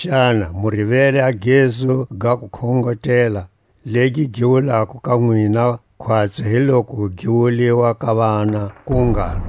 Xana mu rivele a gezu ga kukhongotela, legi gi wulako ka nwina khwatsi hi loku gi wuliwa ka vana? ku ngalo: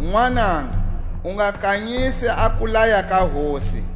Nwananga, u nga kanyisi a kulaya ka Hosi,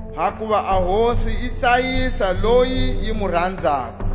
Hakuva a Hosi yi tsayisa loyi yi mu ranzako,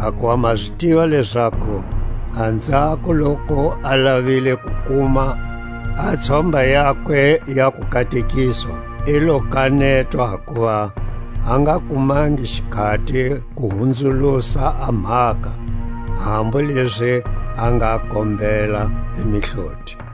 Hakuva ma zi tiva lezaku anzhako loku a lavile ku kuma a tshomba yakwe ya kukatekiswa, i lo kanetwa hakuva a nga kumangi xikhati ku hunzulusa a mhaka, hambu lezi a nga kombela hi mihloti.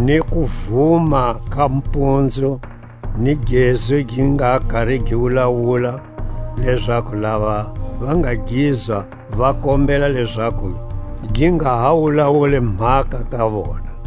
ni kuvuma ka mpunzu, ni gezu gi nga kari gi wulawula, lezaku lava va nga gizwa va kombela lezaku gi nga ha wulawuli mhaka ka vona;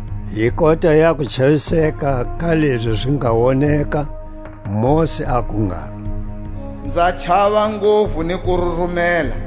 Hi kota ya kuchaviseka ka lezi zi nga woneka, Mosi aku ngalo: Nza chava nguvu ni ku rurumela.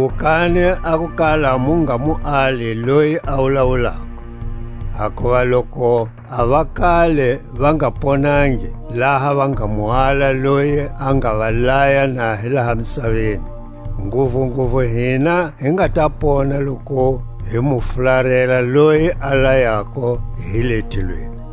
Cuwukani a ku kala mu nga mu ali loyi a wulawulako. Hakuva loku a vakale va nga ponangi, laha va nga mu ala loyi a nga va laya na hi laha misaveni, nguvunguvu hina hi nga ta pona loku hi mu fularela loyi a layako hi le tilweni;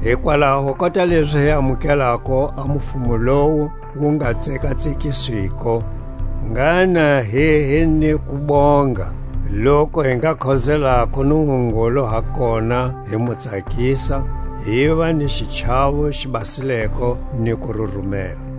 Hikwalaho kota lezi hi amukelako a mufumo lowu wu nga tsekatsekiswiko, ngha na hi hi ni kubonga, loku hi nga khozelako Nungungulu ha kona hi mu tsakisa, hiva ni xichawo xi basileko ni kururumela,